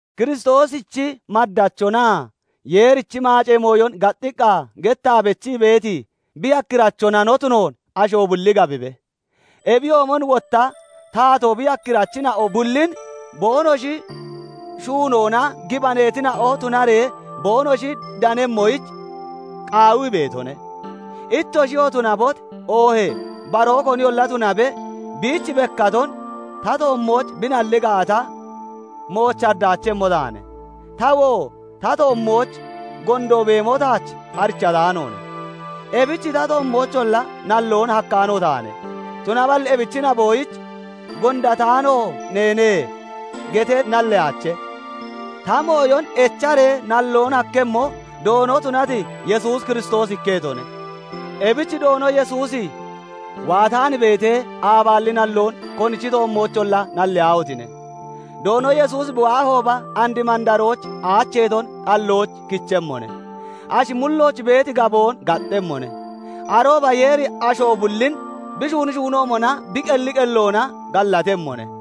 Kiristoosichi maddachonaa Yeerichi maacee mooyon gaxxiqqa gettaa bechii beeti bi yakkirachona no tunoon asho bulli gabibe. Ebiyoomon wotta taatoo bi yakkirachina'o bullin boonoshi shuunoona gibaneetina'o tunaree boonoshi danemmoyich qaawii beetone. Ittoshiyoo tunabot, oohee baroo koniyolla tunabe, biich bekkaton ta toommooch bi nalli gaata, mooch haddaachemmo taane; tawoo ta toommooch gondo beemo taach arichataanoone; ebich ta toommoocholla nalloon hakkaano taane; tunaballi ebichi naboyich "Gondataano neene" getee nalleyaache; ta mooyon echaree nalloon hakkemmo, Doono tunati Yesuus Kiristoosi ikketone. Ebich Doono Yesuusi waataan beetee, aabaalli nalloon konichi toommoocholla nalliyaahotine! Doono Yesuusi bi waahooba, and mandarooch aacheeton xallooch kichemmone; ashi mullooch beeti gaboon gaxxemmone. Arooba Yeeri asho bullin bi shuuni shuunoomona bi qelli qelloona gallatemmone.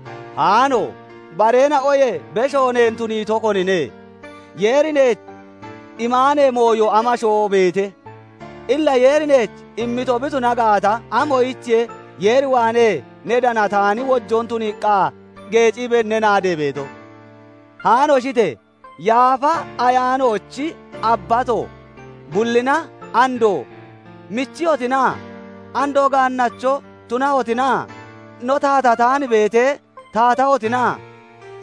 Haano! Bareena'oyee besho neen tuniito, konine? Yeeri neech imaanee mooyo amashoo beete? Illa Yeeri neech immito bi tuna gaata, amoyichiye Yeer waanee ne danataani wojoon tuniiqqa geeciibee ne naadee beeto? Haanoshite! Yaafa Ayaanoochi abbato (dayino) bullina andoo michiyotina? Andoo gaannacho tunahotina? No taatataan beetee, taatahotina?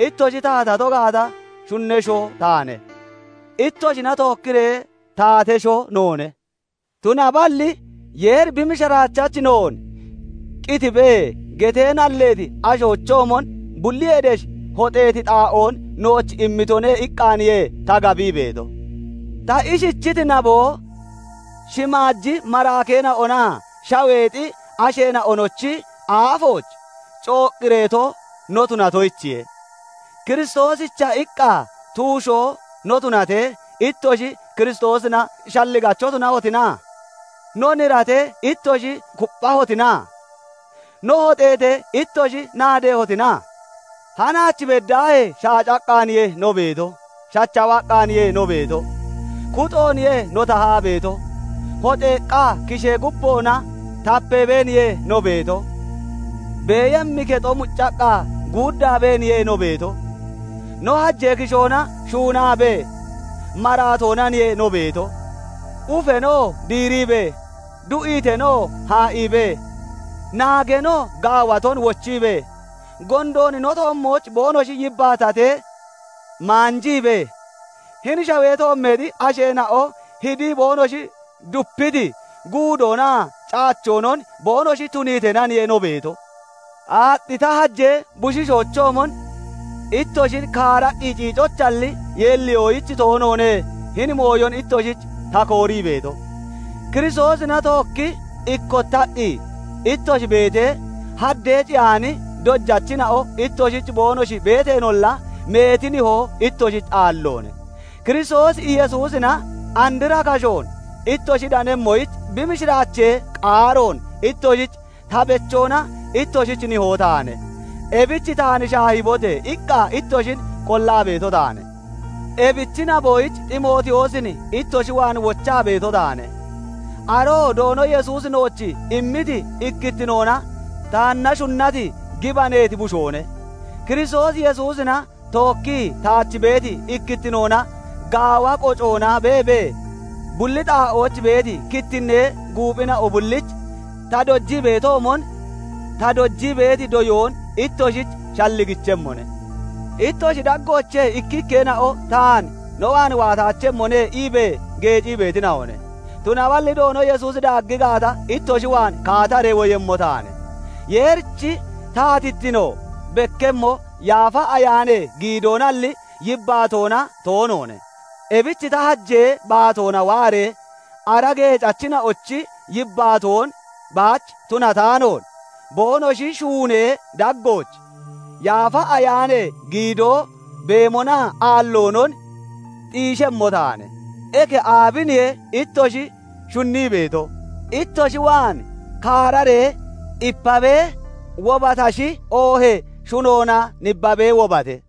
Ittoshi taatato gaata, shunnesho taane; ittoshina tookkiree taatesho noone. Tunaballi "Yeeri bi mishiraachachi noon 'Qitibe' getee nalleeti ashoochoomon bulliyee desh hoxeeti xaa'oon nooch immitone" iqqaaniye ta gabii beeto. Ta ishichiti naboo, shimaaji maraakeena'onaa shaweexi asheena'onochi aafooch coqqireeto no tunatoyichiye. Kiristoosicha iqqa tuushoo no tunatee, ittoshi Kiristoosina shalligacho tunahotina? No niratee, ittoshi kupphahotina? No hoxeetee, ittoshi naadehotina? Hanaach beddaahee shaacaqqaaniye no beeto; shachawaqqaaniye no beeto; kuxooniye no tahaa beeto; hoxeeqqa kishee gubboona tapeebeeniye no beeto; beeyemmi kexo muccaqqa guuddaabeeniye no beeto; no hajee kishoona shuunaabee maraatoonaniye no beeto; ufeenoo diiriibee, du'iiteenoo haa'iibee, naageenoo gaawaton wochiibee, gondoon no toommooch boonoshi yibbaatatee maanjiibee, hini shawee toommeexi asheena'o hidii boonoshi dupiti guudoonaa caachoonon boonoshi tuniiteenaniye no beeto. Aaxxi /ta hajee bushiishoochoomon ittoshin kaaraqqi ciicoyichalli, yeelliyoyich toonoone hini mooyon ittoshich ta koorii beeto. Kiristoosina tookkii ikkottaqqi ittoshi beetee, haddee ciyaani dojachina'o ittoshich boonoshi beeteenolla, meeti nihoo ittoshich aalloone; Kiristoos Yesuusina andra kashoon ittoshi danemmoyich, bi mishiraachee qaaroon ittoshich ta bechoona ittoshich nihoo taane. Ebich "Taan shaahibote!" iqqa ittoshin qollaa beeto taane. Ebichi naboyich Ximootiyoosin ittoshi waan wochaa beeto taane; aroo Doono Yesuusi nooch immiti ikkittinoona taanna shunnati gibaneeti bushoone. Kiristoos Yesuusina tookkii taach beeti ikkittinoona gaawa qocoona beebee, bulli xaa'ooch beeti kittinnee guuphina'o bullich ta dojii beetoomon, ta dojii beeti doyoon ittoshich shalligichemmone. Ittoshi daggoochee ikkikkeena'o taan "No waan waataachemmone" iibee geecii beetina'one. Tunaballi Doono Yesuusi daaggi gaata, ittoshi waan kaataree woyemmo taane. Yeerichi taatittino bekkemmo Yaafa Ayaanee giidoonalli, yibbaatoona toonoone; ebich ta hajee baatoona waaree ara geecachina'ochi yibbaatoon baach tunataanoon, boonoshi shuunee daggooch Yaafa Ayaanee giidoo beemonaa aalloonon xiishemmo taane. Eke aabiniye ittoshi shunnii beeto? ittoshi waan kaararee ipabee wobatashi, oohee shunoona nibbabee wobate?